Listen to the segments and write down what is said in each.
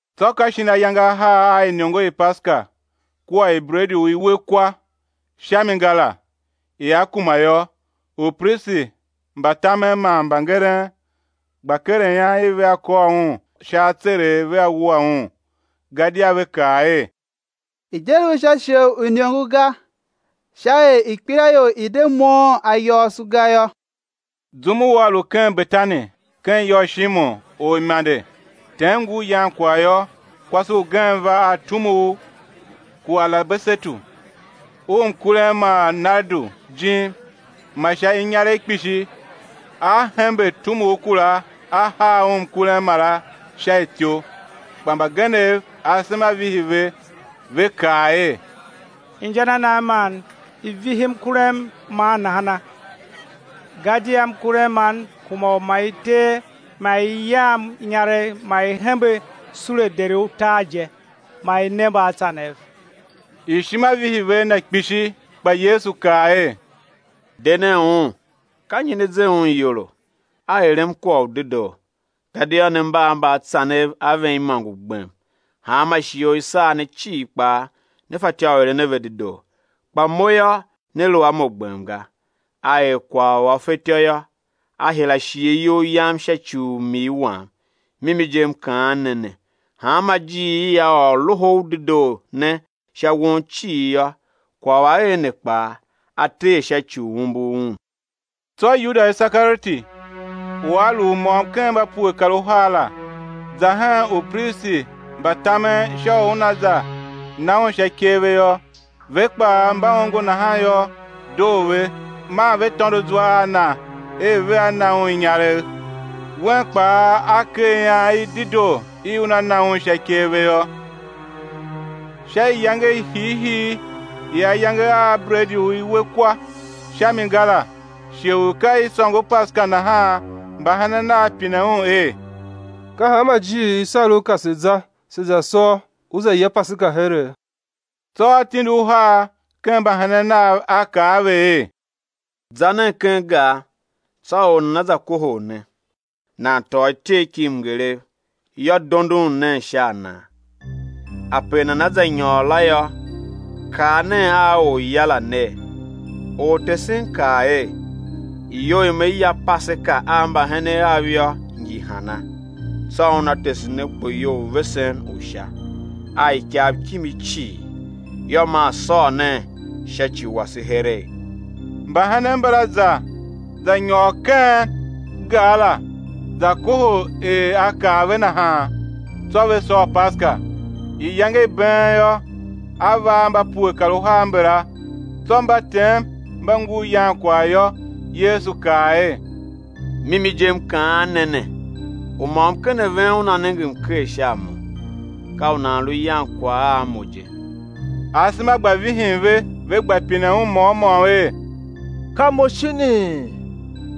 Tsô ka shin ayange ahar a iniongo i Paseka kua i bredi u i we kwa sha mi ga la, ia kuma yô, upristi mba tamen man mbangeren gba keren ian i vea kôr Un sha atseregh, vea wua Un. Gadia ve kaa er: I̱ de lu sha shighe u iniongo ga, sha er ikpelaior i̱ de moughon ayôôso ga yô. Zum u A lu ken Betani ken ya u Shimon, orimande, tem ngur yan kwagh yô, kwase ugen va a tumugh ku alabasetu u mkurem ma nardu jim, ma sha inyaregh kpishi, a hembe tumugh kura a haa Un mkurem mara sha ityou. Kpa mbagenev asema vihi ve, ve kaa er: Inja na nan man i vihi mkurem man nahana? Gadia mkurem man kuma u ma i tee ma, ma i yam inyaregh ma i hembe sule deri utar je, ma i ne mbaatsanev; ishima vihi ve a na kpishi. Kpa Yesu kaa er: De nen un; ka nyi ne ze un iyolo? A erem kwagh u dedoo. Gadia ne mba a mbaatsanev a ven imôngo gbem, hanma shighe u i sar ne cii kpaa ne fatyô u eren a ve dedoo; kpa Mo yô, né lu a Mo gbem ga. A er kwagh u a fetyô yô; a hira shighe iyol Yam sha ci u m-ii Wam. Mimi je M kaan ne ne, hanma ijiir i á ôr Loho u Dedoo ne sha won cii yô, kwagh u a er ne kpaa, á ter sha ci umbur un. Tsô Yuda Isekarioti, u a lu u môm ken mba pue kar uhar la, za hen upristi mba tamen sha u una za na Un sha ikev ve yô. Ve kpaa, mba ongo nahan yô, doo ve, man ve tôndo zwa a na er vea na un inyaregh. Wen kpaa, a ker ian i dedoo i una na Un sha ikev ve yô. Sha iyange i hiihii i ayange a bredi u i we kwa sha mi ga la, shighe u ka i sôngo Paseka nahan, mbahenen Nav pine Un er: Ka hanma ijiir i sar U pe se̱ za, se̱ za sôr, Ú za ya Paseka here? Tsô A tindi uhar ken mbahenen Nav, A kaa a ve er: Za nen ken gar, tsô or nana va kohol ne, nan tôô ityegh ki mngeregh, yô, dondon nen sha a nan. Ape nana za nyôr la yô, kaa nen a orya la ner: Ortesen kaa er: Iyou i Me ya Paseka a mbahenen Av yô, ngi hana? Tsô una tese ne kpoyou u vesen u sha, a ikav kimi cii; yô, maa sôr nen sha ci wase heregh. Mbahenen mbala za za nyôr ken gar la, za kohol er A kaa ve nahan, tsô ve sôr Paseka. Iyange i been yô, A va a mba pue kar uhar mbala. Tsô mba tem, mba ngur yan kwagh yô, Yesu kaa er: Mimi je, M kaan ne ne, u môm ken ven una nenge mker sha a Mo, ka u nan lu yan kwagh a Mo je. Asema gba vihin ve, ve gba pinen Un môm môm er: Ka mo shinii?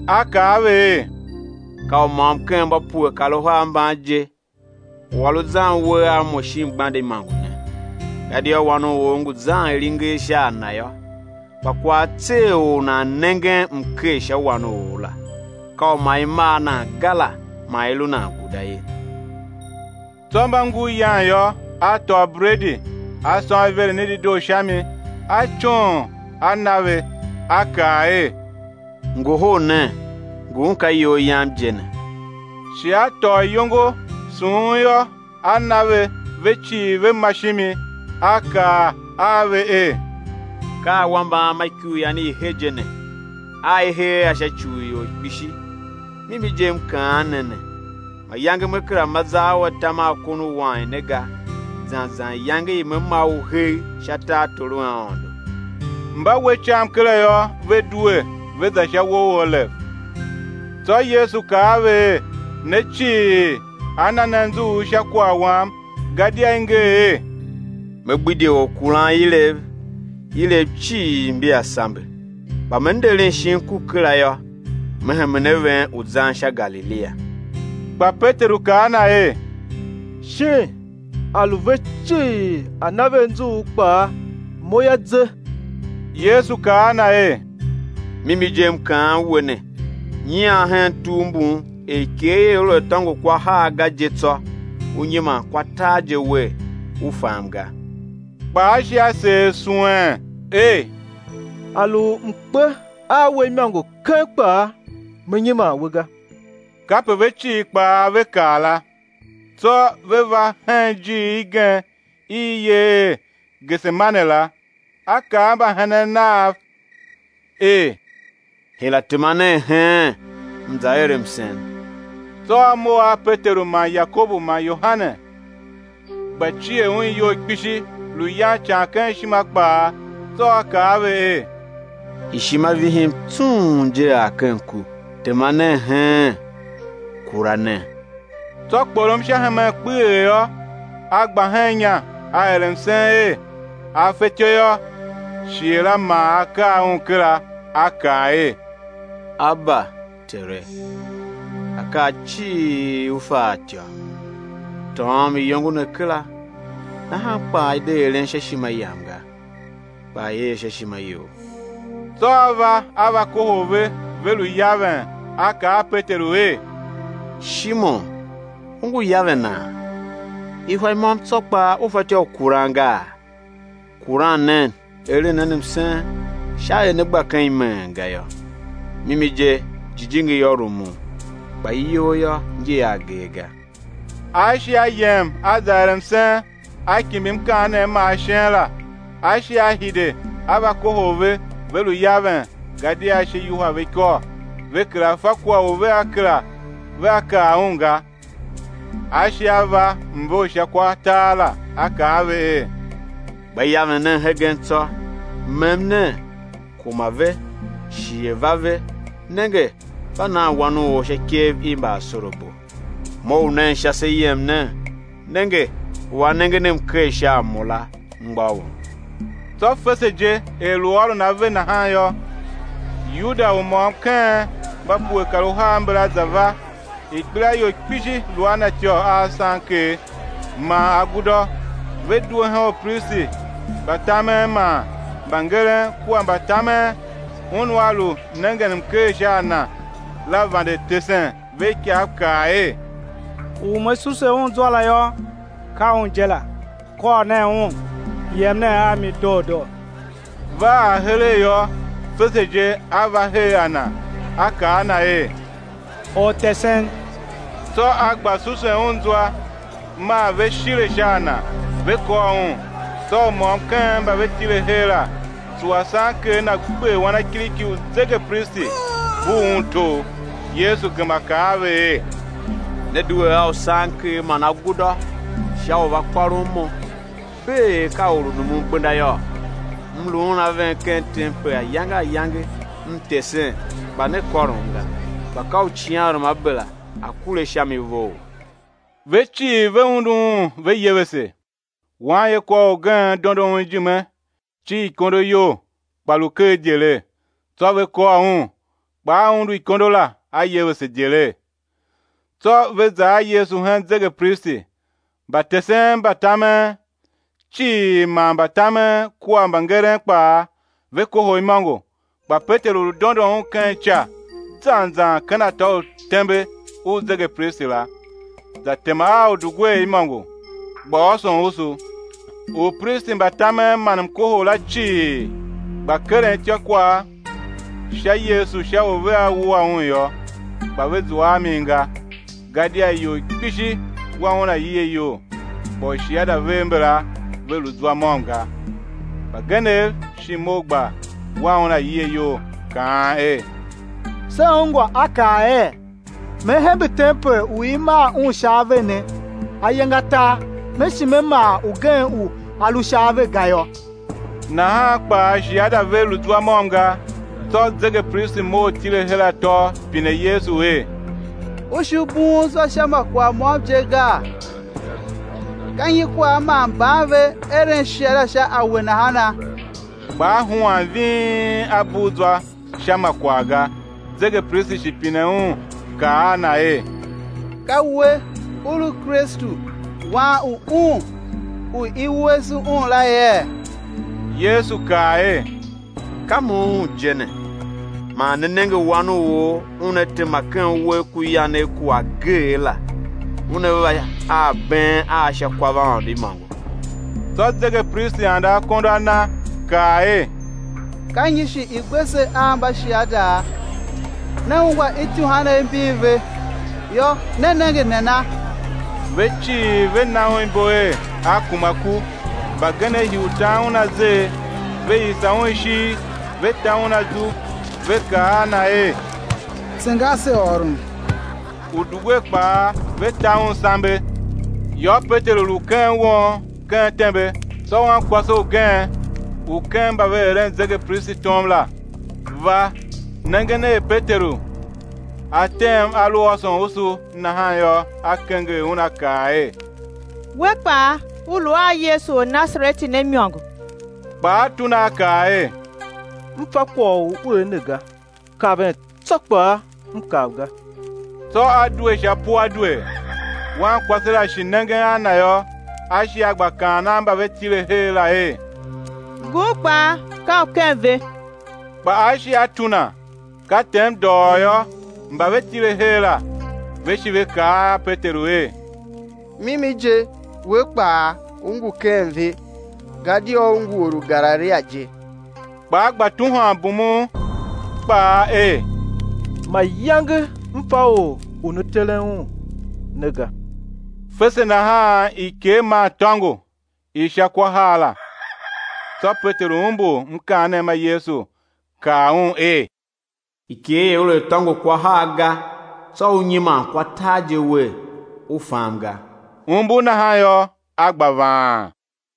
A kaa a ve er: Ka u môm ken mba pue kar uhar mban je, u a lu zan uwegh a Mo shin gbande imôngo ne. Gadia Wan u or ngu zan er i nger sha a Na yô; kpa kwagh á tser or u nan nengen mker sha Wan u or la, ka u ma i mar nan ga la ma i lu nan guda ye. Tsô mba ngur yan yô, a tôô bredi, A sôn iveren i dedoo sha mi A coon, A na ve, A kaa er: Ngohol nen, ngun ka iyol Yam je ne. Shi A tôô iyongo, sughun yô, A na ve; ve cii ve ma shimi. A kaa a va er: Ka awambe Am a ikuryan i he je ne, a i hee a sha ci u ior kpishi. Mimi je M kaan ne ne, mayange me kera ma zar u atam a kon u wain ne ga, zan zan iyange i Me ma u hegh sha tartor u Aôndo. Mba we icam kera yô, ve due, ve za sha uwo u Olev. Tsô Yesu kaa a ve er: Ne cii, á na ne anzughul sha kwagh Wam; gadia i nger er: Me gbidye orkuranilev, ilev cii mbia sambe. Kpa Me nderen shin ku kera yô, Me hemen a ven u zan sha Galilia. Kpa Peteru kaa a Na er: Shin á lu ve cii á na ve anzughul kpaa, mo yô, ze. Yesu kaa a na er: Mimi je M kaan we ne, nyian hen tugh mbun, er ikegh ia lu a tôngo kwa har ga je tsô, ú nyiman kwa tar wer, u fam ga. Kpa a shi a seer suwen er: A lu u m̱ kpe a We imôngo keng kpaa, me nyiman We ga. Kape ve cii kpaa ve kaa la. Tsô ve va hen ijiir igen i i yer er Gesemane la; A kaa a mbahenen Nav er: Hira tema nen heen M̱ za er msen. Tsô A mough a Peteru man Yakobu man Yohane, gba cier Un iyol kpishi, lu yan ican ken ishima kpaa. Tsô A kaa a ve er: Ishima vihim tsung je ar ken ku; tema nen heen, kura nen. Tsô kporom sha hemen kpeghee yô, A gba hen inya, A er msen er, a fetyô yô, shighe la ma a kar Un kera. A kaa er: Aba, Tere! Akaa cii U fa a ityô; tôôm iyongo ne kera, nahan kpaa i̱ de eren sha ishima Yam ga, kpa i̱ er sha ishima You. Tsô A va, A va kohol ve ve lu yaven; A kaa a Peteru er: Shimon, u ngu yavena? Ihwa i môm tsô kpaa u fatyô u kuran gaa? Kuran nen, eren nen msen, sha er né gba ken imeen ga yô; mimi je, jijingi yô, rumun, kpa iyol yô, ngi a agee ga. A shi A yem a za er msen, A kimbir mkaanem ma ashen la. A shi A hide, A va kohol ve, ve lu yaven, gadia ashe yuhwa ve ikôr; ve kera fa kwagh u vea kaa Un ga. A shi A va mve u sha kwa tar la, A kaa a ve er: Gba yaven nen hegen tsô, mem nen. Kuma ve; shighe va ve; nenge, mba nan Wan u or sha ikev i mbaasorabo. Mough nen sha, se yem nen. Nenge, u a nengen mker sha a Mo la, mgbôghom. Tsô fese je, er lu ôron ave nahan yô, Yuda, u môm ken mba pue kar uhar mbala za va, ikpelaior kpishi lu a na ityô a usanker man agudô, ve due hen upristi mba tamen man mbangeren kua mbatamen. Un u a lu nengen mker sha a Na la vande tesen ve ikav, kaa er: U me suse Un zwa la yô, ka Un je la, kôr nen Un, yem nen a mi doo doo. Va ar heregh yô, fese je a va her a Na, a kaa a Na er: Ortesen! Tsô a gba susen Un zwa. Maa ve shile sha a Na, ve kôr Un. Tsô u môm ken mba ve tile her la, tsuwa sanker na, gber wanakiriki u zegepristi, bugh un togh. Yesu gema kaa a ve er: Ne due a usanker man agudô sha u va kôron Mo, bee er ka or u numun gbenda yôô? M luun a ven ken tempel ayange ayange, M tesen, kpa ne kôrom ga; kpa ka u icighanruamabera a̱ kure sha mi vough. Ve cii, ve undu Un ve yevese. Wanyekwaor ugen dondo Un ijime cir ikondo iyol, kpa lu ker idyelegh; tsô ve kôr un, kpa a undu ikondo la, a yevese idyelegh. Tsô ve za a Yesu hen zegepristi. Mbatesen mba tamen cii man mbatamen kua mbangeren kpaa, ve kohol imôngo. Kpa Peteru lu dondon Un ken ica zan zan ken atô u tembe u zegepristi la, za tema a udugwer imôngo, gba ôson usu. Upristi mba tamen man mkohol la cii, gba keren ityôkwagh sha Yesu, sha u vea wua Un yô, kpa ve zua a min ga. Gadia ior kpishi wa Un aie iyol, kpa ushiada vev mbala ve lu zwa môm ga. Mbagenev shi mough gba wan Un aie iyol kaan er: Se ungwa A kaa er: Me hembe tempel u i maa un sha ave ne, ayange atar Me shi Me maa ugen u a lu sha ave ga yô. Nahan kpaa shiada ve lu zwa môm ga. Tsô zegepristi mough tile her atô, pine Yesu er: U shi bughun zwa sha kwagh môm je gaa? Ka nyi kwagh man mban ve eren shiada sha a We nahana? Kpa A huan ving, A bugh zwa sha ma kwagh ga. Zegepristi shi pine Un, kaa a Na er: Ka We, U lu Kristu, Wan u Un u i wuese Un la yee? Yesu kaa er: Ka Mo Un je ne; man né nenge Wan u or, Una tema ken uwegh ku yanegh ku Ageegh la, Una va a abeen a sha kwavaôndo imôngo. Tsô zegepristi ande akondo a na, kaa er: Ka nyi shi i gbe se a mbashiada? Ne ungwa ityuhwanev mbin ve; yô, ne nenge nana? Ve cii ve na un ibo er, A kuma ku. Mbagenev hii u tan Un azer, ve yisa Un ishigh, ve ta Un azu, ve kaa a Na er: Tsenga ase ôron! Udugwer kpaa ve ta Un sambe. Yô, Peteru lu ken won ken tembe; tsô wankwase ugen u ken mba ve eren zegepristi tom la, va. Nengen er Peteru a tem a lu ôson usu, nahan yô, a kenger un, a kaa er: We kpaa, u lu a Yesu Ornasareti ne imôngo. Kpa a tuna a kaa er: M fa kwagh u u er ne ga, kaven tsô kpaa m kav ga. Tsô a due sha puadwer. Wankwase la shi nengen a na yô, a shi a gba kaan a mba ve tile her la er: Ngun kpaa ka u ken ve. Kpa a shi a tuna. Ka tem dôghôô yô, mba ve tile her la, ve shi ve kaa a Peteru er: Mimi je, we kpaa, u ngu ken ve, gadia u ngu or u Galilia je. Kpa a gba tuhwan, bumun kpaa er: Mayange m fa Or u ne teren Un ne ga. Fese nahan ikegh maa tôngo i sha kwa har la; tsô Peteru umbur mkaanem ma Yesu kaa un er: Ikegh ia lu a tôngo kwa har ga, tsô ú nyiman kwa tar je wer, u fam ga. Umbur nahan yô, a gba vaan.